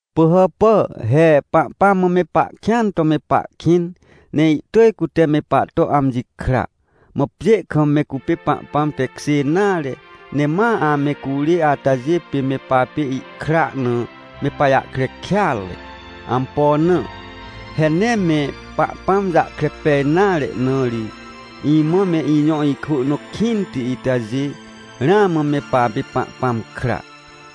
Pỳhàpà, he Pahpãm mã me pahkĩan to me pahkĩn! Ne ihtỳj cute me pahto amji kra. Mã pjê kam me cupê Pahpãm tekjê nare, ne ma ame curê atajê pê me papê ihkra na me pajahkre kêatre. Ampo na? He nee me Pahpãm jahkre pej nare na ri. Imã me ijõ ikwỳ nõ kĩnti itajê, ramã me papê Pahpãm kra.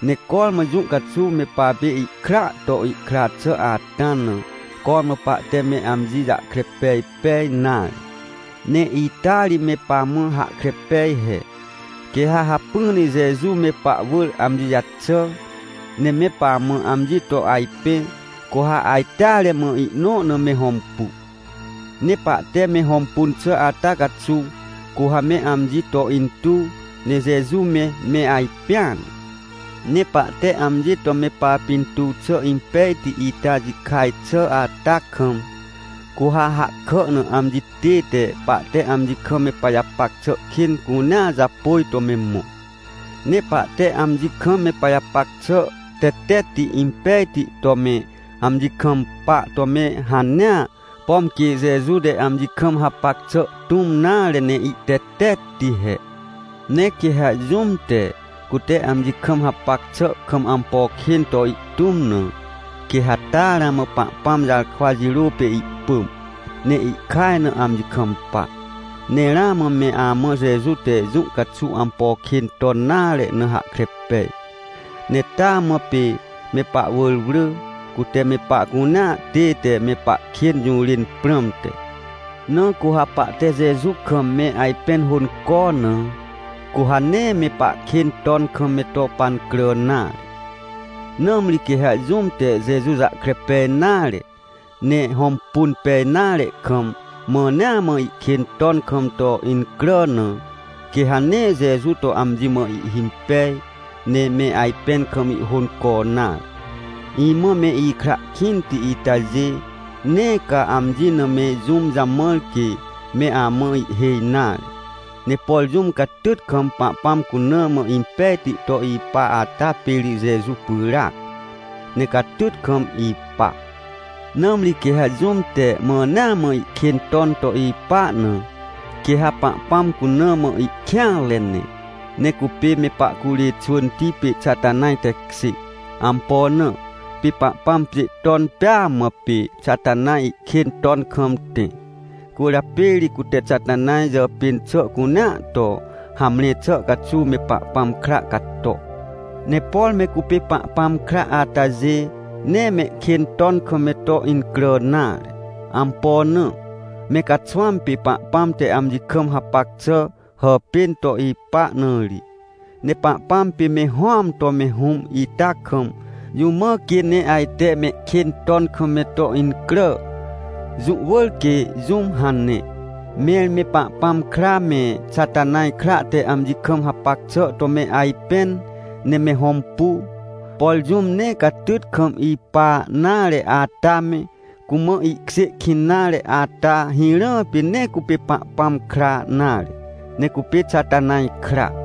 Ne cormã jũ caxuw me papê ihkraa to ihkra xà ata na, cormã pahte me amji jahkre pej pej nare. Ne ita ri me pamã hahkre pej he: Quê ha hacpỹ ne Jeju me pahwỳr amji jaxà, ne me pamã amji to ajpẽ, cu ha ajteare mã, ihnõ na me hõmpu. Ne pahte me hõmpun xà ata caxuw, cu ha me amji to intuw, ne Jeju me, me ajpẽan. Ne pahte amji to me papintuw xà impejti ita jikaj xà ata kam, cu ha hahkà na amji tête pahte amji kam me pajapac xà kên cunea japôj to me mõ. Ne pahte amji kam me pajapac xà tetetti impejti to me amji kampa to me hanea, pom quê Jeju te amji kam hapac xà tũm nare ne ihtetetti he. Ne quê ha jũm te, cute amji kam hapac xà kam ampo kên to ihtũm na, quê ha taa ramã Pahpãm jarkwa jirô pê ihpỳm, ne ihkaj na amji kampa. Ne ramã me amã Jeju te jũ caxuw ampo kên ton nare na hahkre pej. Ne taa mã pê me pahwỳr wrỳ, cute me pahcunea tête me pahkên jũrên prãmte. Na cu ha pahte Jeju kam me ajpẽn hônco na, cu ha nee me pahkên ton kam me to pancrà nare. Nãmri quê ha jũm te Jeju jahkre pej nare, ne hõmpun pej nare kam, mãnea mã ihkên ton kam to incrà na, quê ha nee Jeju to amji mã ihhimpej, ne me ajpẽn kam ihhônco nare. Imã me ikra kĩnti itajê, nee ca amji na me jũm jamãr quê me amã ihhêj nare. Ne por jũm catyt kam Pahpãm cuna mã impejti to ipa ata pê ri Jeju pyràac, ne catyt kam ipa. Nãmri quê ha jũm te mãnea mã ihkên ton to ipa na, quê ha Pahpãm cuna mã ihkêanre ne, ne cupê me pahcurê xwỳnti pê Xatanaj tekjê. Ampo na? Pê Pahpãm pjê ton pêa mã, pê Xatanaj ihkên ton kam tẽ. Cwỳrjapê ri cute Xatanaj jàpên xà cunea to hamre xà caxuw me Pahpãm kra cato. Ne por me cupê Pahpãm kra atajê, nee mehkên ton kam me to incrà nare. Ampo na? Me caxwãm pê Pahpãm te amji kam hapac xà hàpên to ipa na ri. Ne Pahpãm pê me Hũam to me Hũm ita kam, jũ mã quê ne ajte mehkên ton kam me to incrà? Jũ wỳr quê jũm hane! Mẽr me Pahpãm kra, me Xatanaj kra te amji kam hapac xà to me ajpẽn ne me hõmpu. Por jũm nee catyt kam ipa nare ata me, cumã ihkjê kĩn nare ata hirã pê nee cupê Pahpãm kra nare, ne cupê Xatanaj kra.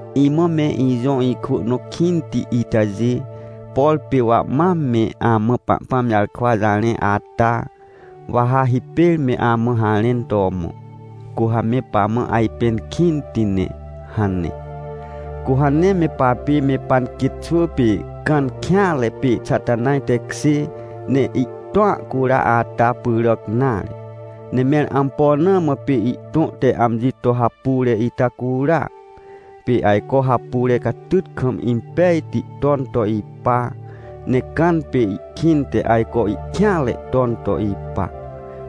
Imã me ijõ ikwỳ nõ kĩnti itajê, por pê wa mam me amã Pahpãm jarkwa jarẽ ata, wa ha hipêr me amã harẽn to mõ: — Cu ha me pamã ajpẽn kĩnti ne — hane. Cu ha nee me papê me panquêt xwỳ pê Cãn kêanre pê Xatanaj tekjê, ne ihtõa cura ata pyràc nare. Ne mẽr ampo na mã pê ihtõ te amji to hapure ita cura? Pê ajco hapure catyt kam impejti ton to ipa, ne Cãn pê ihkĩnte ajco ihkêanre ton to ipa,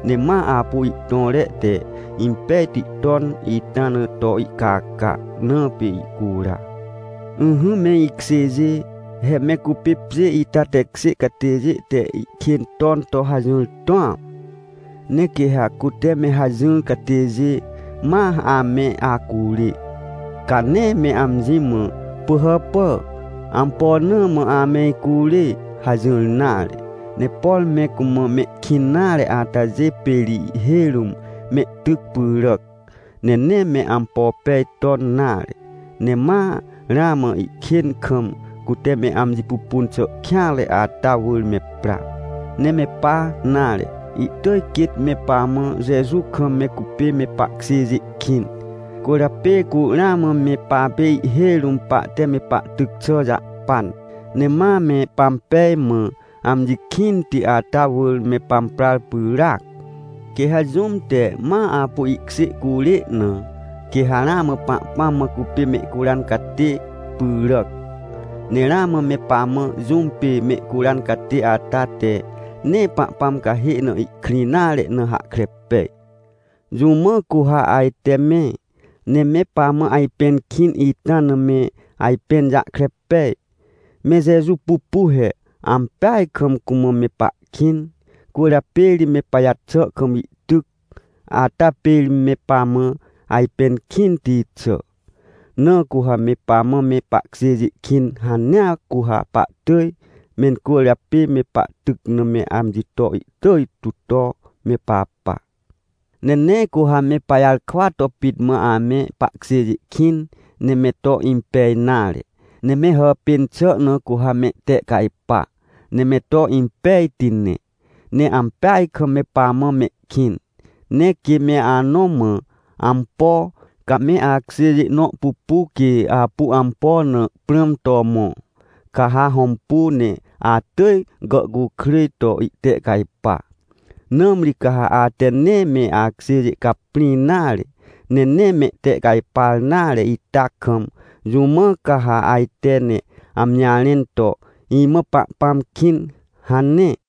ne ma apu ihtõre te impejti ton ita na to ihcaca, na pê ihcura. Ỹhỹ me ikjêjê, he me cupê pjê ita tekjê catêjê te ihkên ton to hajỹr tũam. Ne quê ha cute me hajỹr catêjê ma ame acurê, ca nee me amji mã: — Pỳhàpà, ampo na mã ame icurê? — hajỹr nare. Ne por me cumã mehkĩn nare atajê pê ri ihhêj rũm mehtyc pyràc, ne nee me ampo pej ton nare, ne ma ramã ihkên kam, cute me amji pupun xà kêanre ata wỳr me pra. Ne me pa nare. Ihtỳj quêt me pamã Jeju kam me cupê me pahkjêjê kĩn. Cwỳrjapê cu ramã me papê ihhêj rũm pahte me pahtyc xà jahpan, ne ma me pampej mã, amji kĩnti ata wỳr me pamprar pyràac. Quê ha jũm te ma apu ihkjê curê na, quê ha ramã Pahpãm mã cupê mehcuran catê pyràc. Ne ramã me pamã, jũm pê mehcuran catê ata te nee Pahpãm cahê na ihkrĩ nare na, hahkre pej. Jũ mã cu ha ajte me, ne me pamã ajpẽn kĩn ita na me ajpẽn jahkre pej? Me Jeju pupu he. Ampeaj kam cumã me pahkĩn, cwỳrjapê ri me pajaxà kam ihtyc. Ata pê ri me pamã ajpẽn kĩnti xà. Na cu ha me pamã me pahkjêjê kĩn hanea, cu ha pahtỳj mencwỳrjapê me pahtyc na me amji to ihtỳj tu to me papa. Ne nee cu ha me pajarkwa to pit mã ame pahkjêjê kĩn, ne me to impej nare. Ne me hàpên xà na cu ha me tehcajpa, ne me to impejti ne, ne ampeaj kam me pamã mehkĩn. Ne quê me anõ mã ampo, ca me akjêjê nõ pupu quê apu ampo na prãm to mõ, ca ha hõmpu ne atỳj gàhcukrêj to ihtehcajpa. Nãmri ca ha ate nee me akjêjê caprĩ nare, ne nee mehtehcajpar nare ita kam, jũ mã ca ha ajte ne amji jarẽn to: — Imã Pahpãm kĩn — hane?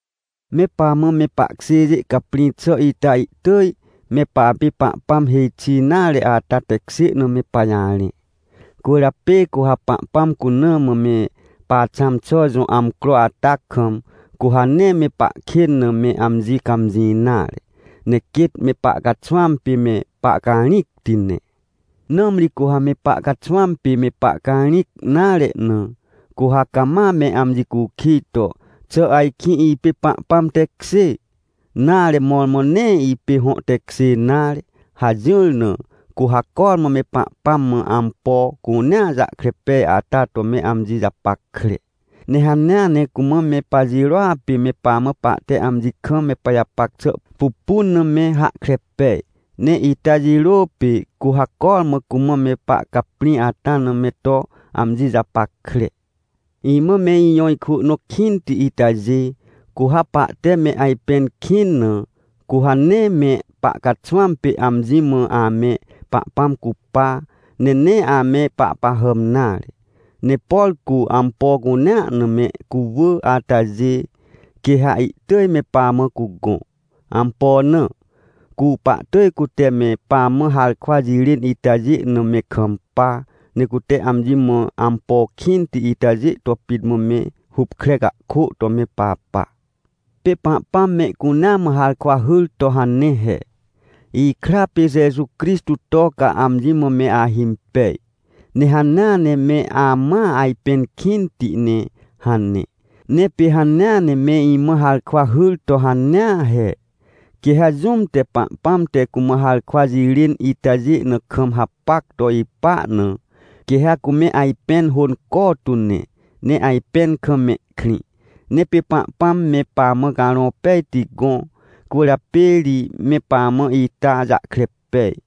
Me pamã me pahkjêjê caprĩ xà ita ihtỳj me papê Pahpãm hêj xi nare ata tekjê na me pajarẽ. Cwỳrjapê cu ha Pahpãm cuna mã me paxãm xà jõ amcro ata kam, cu ha nee me pahkên na me amji cãmjĩ nare, ne quêt me pahcaxwãm pê me pahcarĩcti ne. Nãmri cu ha me pahcaxwãm pê me pahcarĩc nare na, cu ha cama me amji cukij to: — Xà ajkĩ ipê Pahpãm tekjê? Nare mõrmõ nee ipê hõ tekjê nare — hajỹr na, cu ha cormã me Pahpãm mã ampo cunea jahkre pej ata to me amji japackre. Ne hanea ne cumã me pajirôa pê me pamã pahte amji kam me pajapac xà pupun na me hahkre pej. Ne ita jirô pê cu ha cormã cumã me pahcaprĩ ata na me to amji japackre. Imã me ijõ ikwỳ nõ kĩnti itajê, cu ha pahte me ajpẽn kĩn na, cu ha nee me pahcaxwãm pê amji mã ame Pahpãm cupa, ne nee ame pahpahàm nare. Ne por cu ampo cunea na me cuwỳ atajê, quê ha ihtỳj me pamã cugõ. Ampo na? Cu pahtỳj cute me pamã harkwa jirên itajê na me kampa, ne cute amji mã ampo kĩnti itajê to pit mã me hupkre cahkô to me papa. Pê Pahpãm mehcunea mã harkwa hyr to hane he: — Ikra pê Jeju Crixtô to ca amji mã me ahimpej, ne hanea ne me amãa ajpẽn kĩnti ne — hane. Ne pê hanea ne me imã harkwa hyr to hanea he. Quê ha jũm te Pahpãm te cumã harkwa jirên itajê na kam hapac to ipa na, quê ha cume ajpẽn hônco tu ne, ne ajpẽn kam mehkrĩ. Ne pê Pahpãm me pamã Carõ Pejti gõ, cwỳrjapê ri me pamã ita jahkre pej.